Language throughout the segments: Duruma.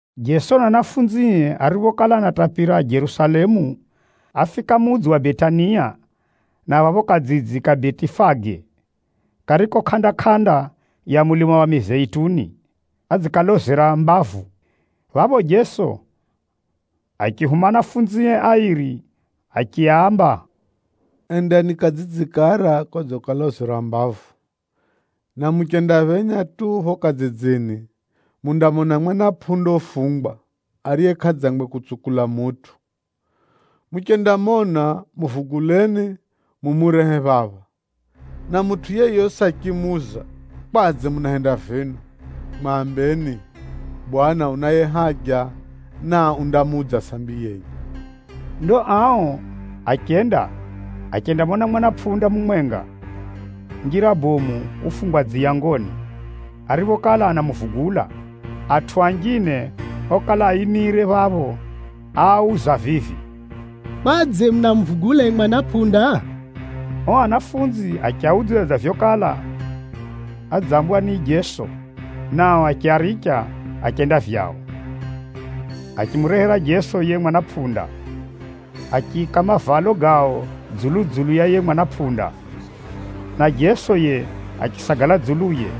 Jeso na ahumwae ariphokala anatapira Jerusalemu, áfika mudzi wa Betania, na phapho kadzidzi kariko kuko Betifage, kariko kʼanda-kʼanda ya mulima wa Mizeituni, achikala adzikalozera mbavu. Phapho, Jeso achihuma ahumwae airi, achiaamba, “Endani kadzidzi kara kodzikalozera mbavu, na muchendaphenya tu phapho kadzidzini, mundamona mwana pʼunda ufungwa, ariye kʼadzangwe kutsukula mutʼu. Muchendamona, muvuguleni, mumurehe phapha. Na mutʼu yeyosi achimuuza, ‘Kwadze munahenda vino?’ Mwambeni, ‘Bwana unaye haja, na undamuudza sambi yenye.’” Ndo ao achenda, achendamona mwana pʼunda mumwenga, njira bomu ufungwa muyangoni. Ariphokala anamuvugula, atʼu anjine okala aimire phapho áauza vivi, “Kwadze munamuvugula yiye mwana pʼunda?” Ao ahumwa achiaudzidza dza vyokala adzambwa ni Jeso, nao achiaricha achenda vyao. Achimurehera Jeso yiye mwana pʼunda, achiika mavalo gao dzulu-dzulu ya yiye mwana pʼunda, na Jeso yiye achisagala dzuluye.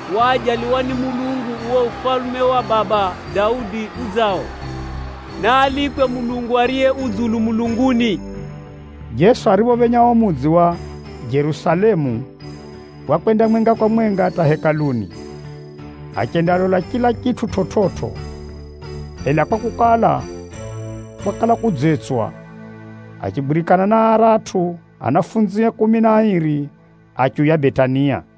Waajaliwa ni Mulungu uo Ufalume wa Baba Daudi udzao! Naalikwe Mulungu ariye u dzulu mulunguni!” Jeso ariphophenya mudzi wa Jerusalemu, wakwenda mwenga kwa mwenga hata Hekaluni, achendalola chila chitʼu chividzo. Ela kwakukala, kwakala kudzetswa, achigwirikana na aratʼu anafunzie kumi na airi, achiuya Betania.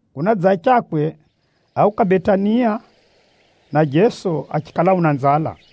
Kunadzachakwe, áuka Betania, na Jeso achikala una nzala.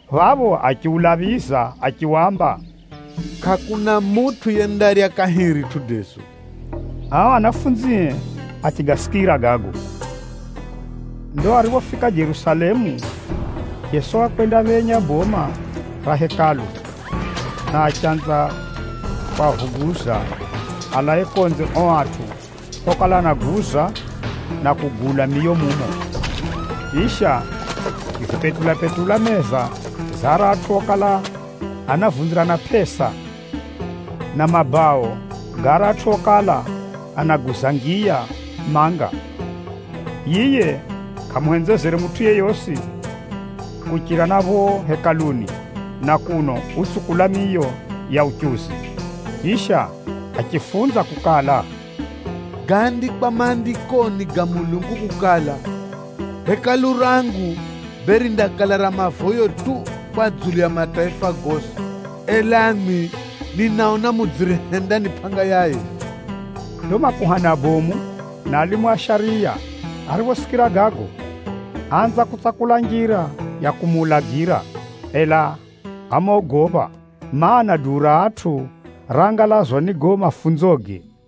Phapho achiulaphiza achiwamba, “Kʼakuna mutʼu yendarya kahiri matundago!” Ao ahumwae achigasikira gago. Ndo ariphofika Jerusalemu, Jeso wakwendaphenya boma ra Hekalu, na achanza kwavuguza alae konze ao atʼu okala anaguza, na kugula miyo mumo. Chisha, achizipetula-petula meza za aratʼu okala anavunzirana pʼesa, na mabao ga aratʼu okala anaguza ngiya manga. Yiye kʼamuhenzezere mutʼu yeyosi kuchira na phapho Hekaluni na kuno utsukula miyo ya uchuzi. Chisha achifunza kukala, “Gaandikwa Maandikoni ga Mulungu kukala, ‘Nyumba yangu yindaihiwa nyumba ya mavoyo kwa mataifa gosi.’ Ela mwimwi, ninaona mudziyihenda ni pʼanga ya aivi!” Ndo makuhani abomu na alimu a shariya ariphosikira gago, áanza kutsakula njira ya kumuulagira. Ela ámogopha, mana, duu ra atʼu raangalazwa ni gago mafunzoge.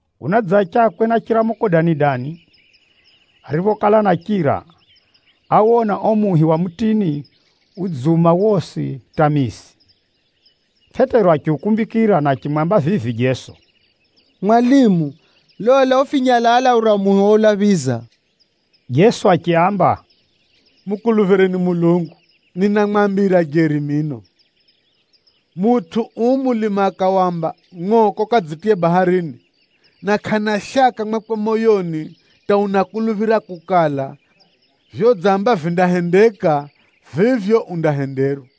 Kunadzachakwe na chiramuko dani-dani, ariphokala anachira, áwona uo muhi wa mutini udziuma wosi hata mizi. Pʼetero achiukumbikira na achimwamba vivi Jeso, “Mwalimu, lola, ufinyalala ura muhi oulaphiza!” Jeso achiaamba, “Mukuluphireni Mulungu! Akor 13:2Ninamwambira jeri mino, mutʼu uu mulima akawamba, ‘Ngʼoka ukadzitiye baharini’ na kʼana shaka mwakwe moyoni hata unakuluphira kukala, vyodzamba vindahendeka, vivyo undahenderwa.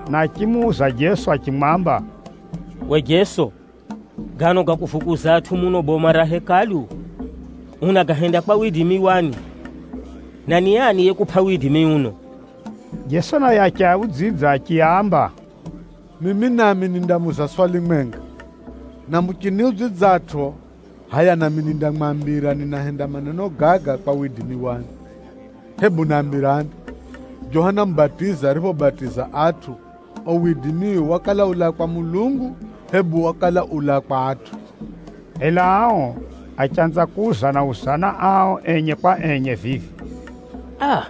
na achimuuza Jeso achimwamba, “Uwe Jeso, gano ga kuvuguza atʼu muno boma ra Hekalu, unagahenda kwa widimi wani? Na ni ani yekupʼa widimi uno?” Jeso naye achiaudzidza achiaamba, “Mimi nami nindamuuza swali mwenga, na muchiniudzidzatʼo, hʼaya nami nindamwambira ninahenda maneno gaga kwa widimi wani. Hebu nambirani, Johana Mubatizi ariphobatiza atʼu, uo widimiwe wakala ulaa kwa Mulungu, hebu wakala ulaa kwa atʼu?” Ela ao achanza kuuzana-uzana ao enye kwa enye vivi, “Aa!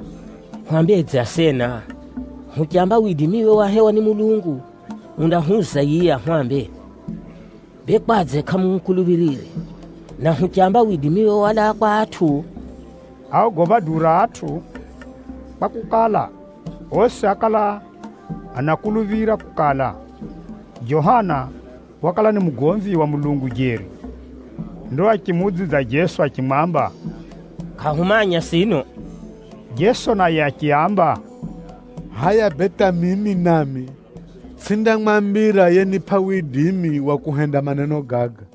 Hwambedze asena? Huchamba widimiwe wahewa ni Mulungu, undahwuza yiye ahwambe, ‘Bee kwadze kʼamumukuluphirire? Na huchamba widimiwe walaa kwa atʼu?’” (Áogopha duu ra atʼu, kwakukala, osi ákala anakuluphira kukala, Johana wakala ni mugomvi wa Mulungu jeri.) Ndo achimuudzidza Jeso achimwamba, “Kʼahumanya sino.” Jeso naye achiaamba, “Hʼaya bee hata mimi nami, tsʼindamwambira yenipʼa widimi wa kuhenda maneno gaga.”